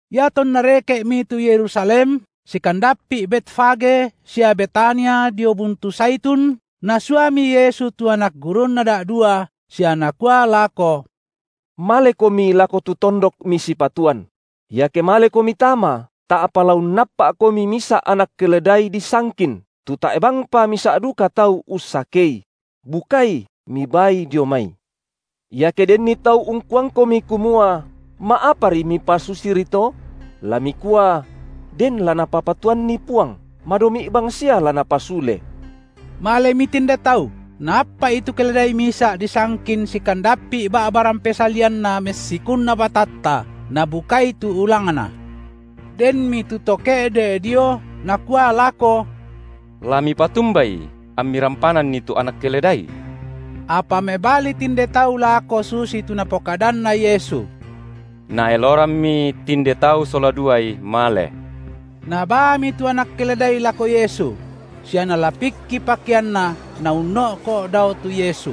Iatonna reke’mi tu Yerusalem, sikandappi’ Betfage sia Betania dio buntu Zaitun, Nasuami Yesu tu anak gurunNa da’dua, sia Nakua lako: Malekomi lako tu tondok misipatuan; iake malekomi tama, ta’pa la unnappa’komi misa’ anak keledai disangkin, tu tae’ bangpa misa’ duka tau ussakei; bukai, mibaai dio mai. Iake denni tau ungkuangkomi kumua: Ma’apari mipasusiri to?, la mikua; den la Napapatuanni Puang, madomi’ bangsia la Napasule. Malemi tinde tau, naappa’i tu keledai misa’ disangkin sikandappi’ ba’ba rampe salianna messikunna batatta, nabukai tu ulangna. Denmi tu to ke’de’ dio nakua lako: La mipatumbai ammi rampananni tu anak keledai? Apa mebali tinde tau lako susitu Napokadanna Yesu; naelorammi tinde tau sola duai male. Nabaami tu anak keledai lako Yesu; sia nalapikki pakeanna Naunno’ko’ dao tu Yesu.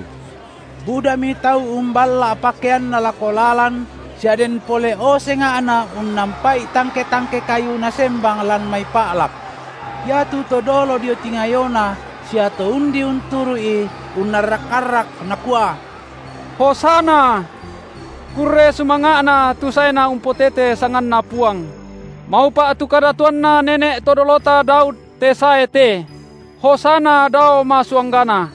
Budami tau umballa’ pakeanna lako lalan sia den pole’o senga’na unnampa’i tangke-tangke kayu nasembang lan mai pa’lak. Iatu to dolo dio tingayoNa sia to undi unturu’I unnarrak-arrak, nakua: Hosanna! Kurre sumanga’na tu saena umpotete sanganNa Puang; Maupa’ tu kadatuanna nene’ to dolota Daud te sae te; Hosanna dao masuanggana.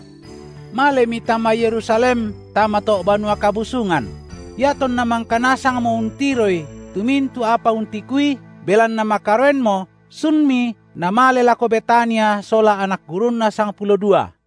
Malemi tama Yerusalem tama to’ Banua Kabusungan; iatonna mangka nasangmo untiroi tu mintu’ apa untikuI, belanna makaroenmo, sunMi Namale lako Betania sola anak gurunNa sangpulo dua.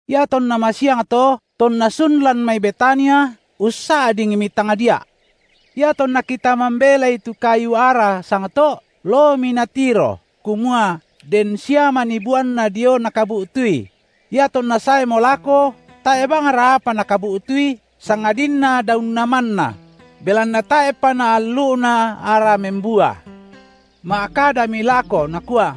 Iatonna masiang to, tonna sun lan mai Betania, ussa’dingmi tangdia’. Iatonna kita mambelai tu kayu ara sangto’, loomi Natiro, kumua den sia manii buanna dio Nakabu’tui! Iatonna saemo lako, tae’ bangra apa Nakabu’tui, sangadinna daunna manna! belanna tae’pa naallu’na ara membua. Ma’kadami lako nakua: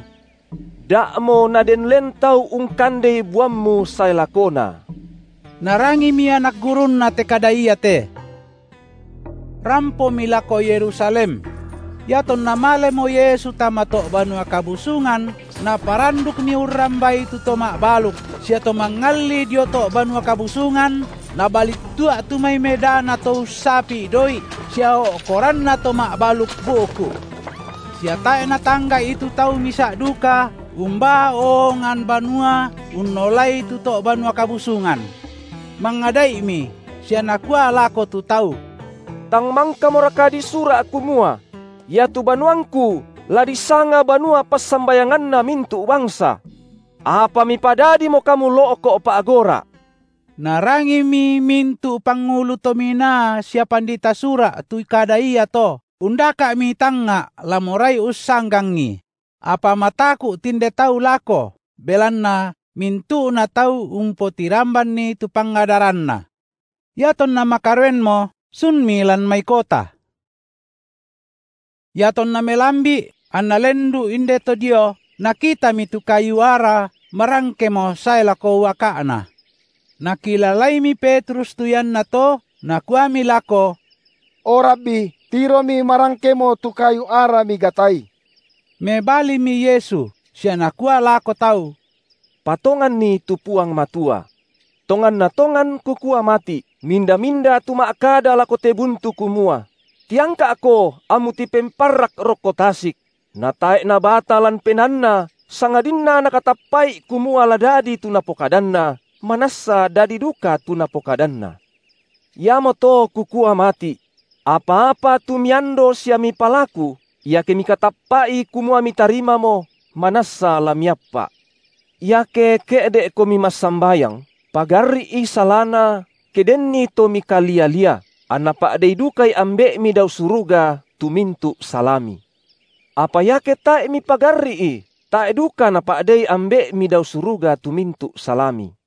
Da’mo naden len tau ungkandei buammu sae lakona. Narangimi anak gurunNa te kada iate. Rampomi lako Yerusalem. Iatonna malemo Yesu tama to’ Banua Kabusungan, Naparandukmi urrambai tu to ma’baluk sia to mangalli dio to’ Banua Kabusungan, Nabalittua’ tu mai medana to ussapi’ doi’, sia o’koranna to ma’baluk bu’ku’. Sia tae’ Natangga’i tu tau misa’ duka umbaa oongan banua unnolai tu to’ Banua Kabusungan. Mangada’imi sia Nakua lako tu tau: Tang mangkamoraka disura’ kumua: Iatu banuangKu la disanga banua passambayanganna mintu’ bangsa? Apa mipadadimo kamu lo’ko’ pa’gora’. Narangimi mintu’ pangulu to minaa sia pandita Sura’ tu kada iato, undaka’mi tangnga’ la morai ussanggangi; apa mataku’ tinde tau lako, belanna mintu’na tau umpotirambanni tu pangadaranNa. Iatonna makaroenmo sunmi lan mai kota. Iatonna melambi’ anna lendu’ indeto dio, nakitami tu kayu ara marangkemo sae lako uaka’na. Nakilalaimi Petrus tu iannato, nakuami lako: O Rabbi tiromi marangkemo tu kayu ara Migatai. Mebalimi Yesu sia Nakua lako tau: Patonganni tu Puang Matua. Tonganna tongan, Kukua mati’, minda-minda tu ma’kada lako te buntu kumua: Tiangka’ko ammu tipemparrak rokko tasik! natae’ nabata lan penaanna sangadinna nakatappa’i kumua la dadi tu napokadanna, manassa dadi duka tu napokadanna. Iamoto Kukua mati’: Apa-apa tu miando sia mipalaku, iake mikatappa’i kumua mitarimamo, manassa la miappa’. Iake ke’de’komi massambayang, pagarri’i salana ke denni to mikalia-lia, anna pa’dei dukai Ambe’mi dao suruga tu mintu’ salami. Apa iake tae’ mipagarri’i, tae’ duka Napa’dei Ambe’mi dao suruga tu mintu’ salami.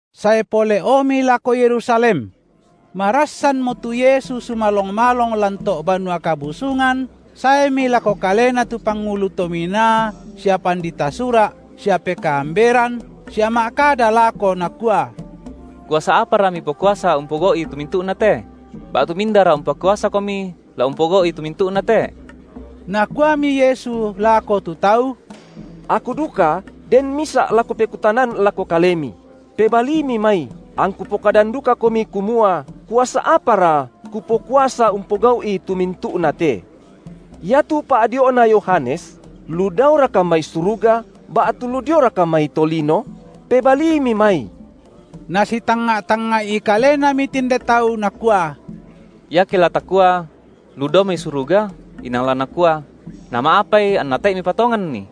Sae pole’omi lako Yerusalem. Marassanmo tu Yesu sumalong-malong lan to’ Banua Kabusungan, saemi lako Kalena tu pangulu to minaa sia pandita Sura’ sia pekaamberan sia ma’kada lako nakua: Kuasa apara Mipokuasa umpogau’i tu mintu’na te? Ba’tu mindara umpakuasaKomi la umpogau’i tu mintu’na te? Nakuami Yesu lako tu tau: Aku duka den misa’ la Kupekutanan lako kalemi; pebaliimi mai, angKu pokadan dukakomi kumua kuasa apara, Kupokuasa umpogau’i tu mintu’nate. Iatu pa’dio’na Yohanes, lu daoraka mai suruga, ba’tu lu dioraka mai tolino? Pebaliimi mai. Nasitangnga’-tangnga’i kalenami tinde tau, nakua: Iake la takua: lu dao mai suruga, inang la Nakua: nama’apai anna tae’ mipatonganni?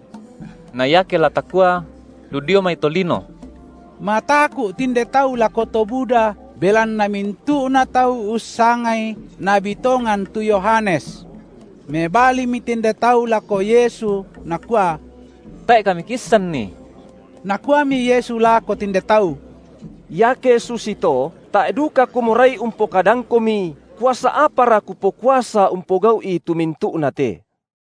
Na iake la takua: lu dio mai tolino –; mataku’ tinde tau lako to buda, belanna mintu’na tau ussangai nabi tongan tu Yohanes. Mebalimi tinde tau lako Yesu, nakua: Tae’ kami kiisanni. Nakuami Yesu lako tinde tau: Iake susito tae’ duka Kumorai umpokadangkomi kuasa apara Kupokuasa umpogau’i tu mintu’na te.